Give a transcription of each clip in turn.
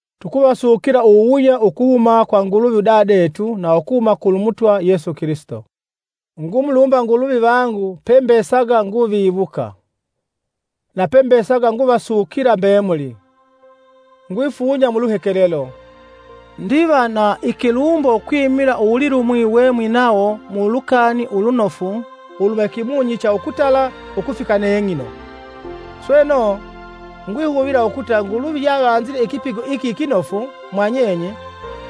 Tukuvasukila uwuwuya ukuhuma kwa Nguluvi udadetu na ukuhuma kulu Mutwa Yesu Kilisito. Ngumulumba Nguluvi vangu pembesaga nguviwuka, na pembesaga nguvasukila mbemuli, ngwifunya muluhekelelo, ndiva na ikilumbo ukwimila uwulilumwi we mwinawo mu Lukani Ulunofu uluhuma ikimunyi icha ukutala ukufika neng'ino. Sweno, ngwihuvila ukuta Nguluvi yeavanzile ikipigo iki ikinofu mwanyenye,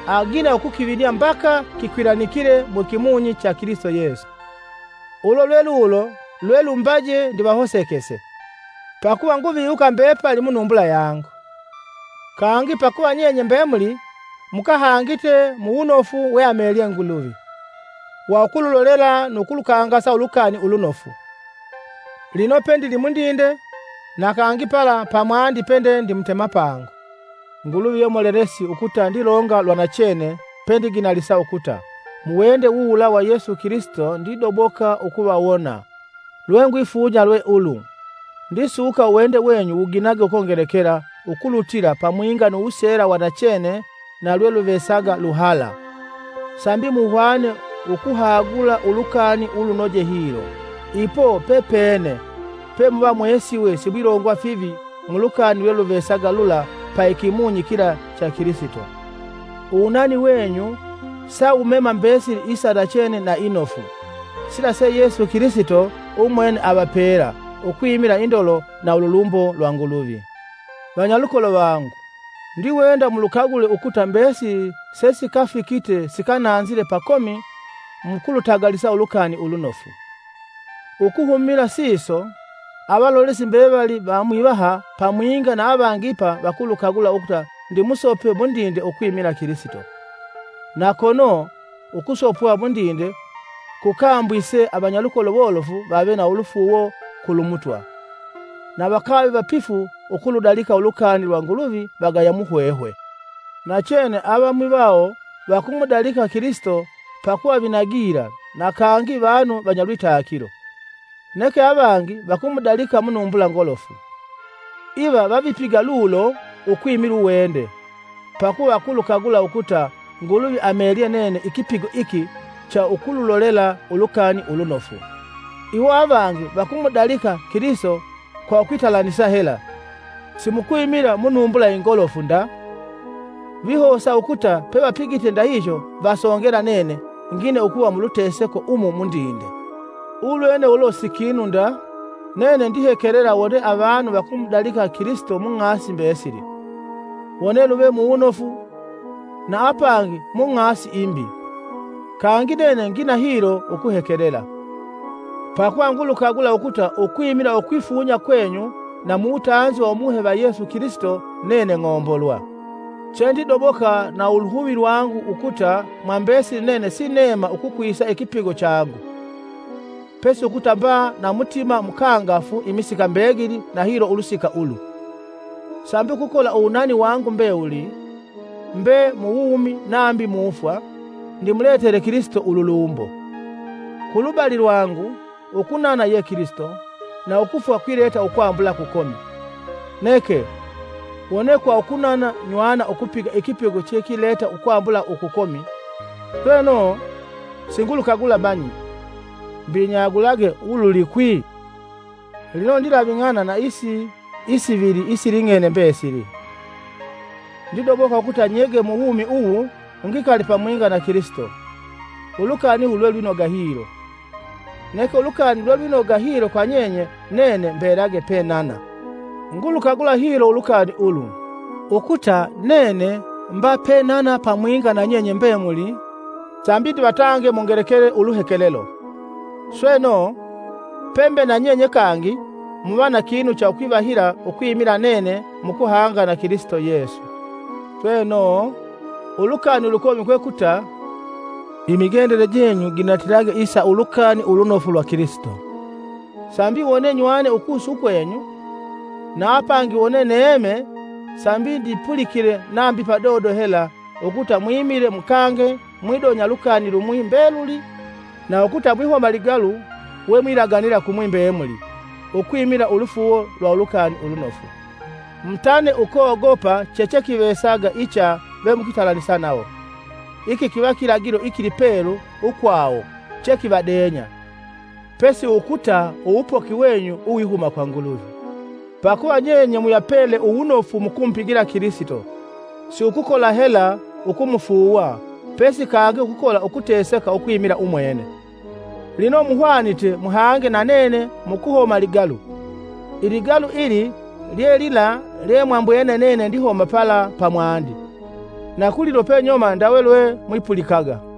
agina ukukivinia mbaka kikwilanikile mu kimunyi cha Kilisito Yesu. Ulo lwelulo lwelumbaje ndivahosekese, pakuva nguviwuka mbepali munumbula yangu. Kangi pakuva nyenye mbemuli mukahangite mu wunofu weamelye Nguluvi, wa ukululolela nu kulukangasa Ulukani Ulunofu, lino pendili mundinde na kangi pala pamwandi pende ndimutemapangu. Nguluvi ye molelesi ukuta ndilonga lwa nachene pendiginalisa ukuta, muwende wuwula wa Yesu Kilisito ndidoboka ukuvawona. Lwengwifunya lwe ulu; ndisuka uwende wenyu wuginage ukongelekela ukulutila pamwinga nu wuseela wa nachene na lweluvesaga luhala, sambi muhwane ukuhagula ulukani ulunoje hilo. Ipo pepene pemuva mwesiwe simwilongwa fivi mulukani lweluvesaga lula pa ikimunyi kila cha Kilisito. Uwunani wenyu sawumema mbesili isa nachene na inofu, sila se Yesu Kilisito umwene avapela, ukwimila indolo na ululumbo lwa Nguluvi. Vanyalukolo vangu, ndiwenda mulukagule ukuta mbesili sesikafikite sikananzile pakomi mukulutagalisa Ulukani Ulunofu. Ukuhumila siso, avalolesi mbevali va mwivaha pamwinga na avangi ipa vakulukagula ukuta ndimusope mundinde ukwimila Kilisito. Na kono ukusopwa mundinde kukambwise avanyalukolo wolofu vave na ulufuuwo kulu Mutwa, na vakave vapifu ukuludalika ulukani lwa Nguluvi vagaya muhwehwe. Nachene avamwi vawo vakumudalika Kilisito pakuva vina gila na kangi vanu vanyalwitakilo; neke avangi vakumudalika munumbula ngolofu. Iva vavipiga lulo ukwimila uwende, pakuva vakulukagula ukuta Nguluvi amelye nene ikipigo iki cha ukululolela Ulukani Ulunofu. Iwo avangi vakumudalika Kilisito kwa ukwitalanisa hela simukwimila munumbula ingolofu nda, vihosa ukuta pevapigite ndahihyo vasongela nene ngine ukuva muluteseko umu mundinde. Ulwene ulo sikinu nda! Nene ndihekelela wone avanu vakumudalika Kilisito mung'asi mbesili, wone luve muwunofu na apangi mung'asi imbi. Kangi nene ngina hilo ukuhekelela, pakuva ngulukagula ukuta ukwimila kwifunya kwenyu na muwutanzi wa Umuhe va Yesu Kilisito, nene ng'ombolwa. Chendidoboka na uluhuvi lwangu ukuta mwambesili nene sineema ukukwisa ikipigo changu, pesi ukuta mba na mutima mukangafu imisika mbegili na hilo ulusika ulu, sambi ukukola uwunani wangu mbewuli, mbe muwumi nambi mufwa, ndimuletele Kilisito ululumbo. Kulubali lwangu, ukunana ye Kilisito, na ukufwa kwileta ukwambula kukomi. neke, wone kwa ukunana nywana ukupiga ikipigo chekileta ukwambula ukukomi, sweno, singulukagula manyi, mbi nyagulage ululikwi! Lino ndilaving'ana na isi isivili isiling'ene mbesili. Ndidoboka ukuta nyege muwumi uwu ngikale pamwinga na Kilisito, ulukani ulu lwelwinoga hilo; neke ulukani lwelwinoga hilo kwa nyenye nene mbelage penana. Ngulukagula hilo ulukani ulu, ukuta nene mba penana pamwinga na nyenye mbemuli, sambi ndivatange mongelekele uluhekelelo, sweno, pembe na nyenye kangi, muva na kinu cha ukwivahila ukwimila nene mukuhanga na Kilisito Yesu. Sweno, ulukani ulukomi kwekuta imigendele jenyu ginatilage chetwisaka Ulukani Ulunofu lwa Kilisito, sambi wone nywane ukusa ukwenyu na apangi wone neeme sambi ndipulikile nambi padodo hela ukuta mwimile mukange mwidonya lukani lumwi mbeluli na ukuta mwihoma ligalu we mwilaganila kumwi mbemuli ukwimila ulufuuwo lwa Ulukani Ulunofu. Mutane ukogopa chechekivesaga icha vemukwitalanisa nawo. Iki kiva kilagilo ikilipelu ukwawo chekivadenya, pesi ulwa uwupoki wenyu uwihuma kwa Nguluvi. Pakuva nyenye mwivapele uwunofu mukumupigila Kilisito si ukukola hela ukumufuuwa pesi kangi ukukola ukuteseka ukwimila umwene. Lino muhwanite muhange na nene mukuhoma ligalu. Iligalu ili lyelila lyemwambwene nene ndihoma pala pamwandi, na kulino penyoma ndawe lwe mwipulikaga.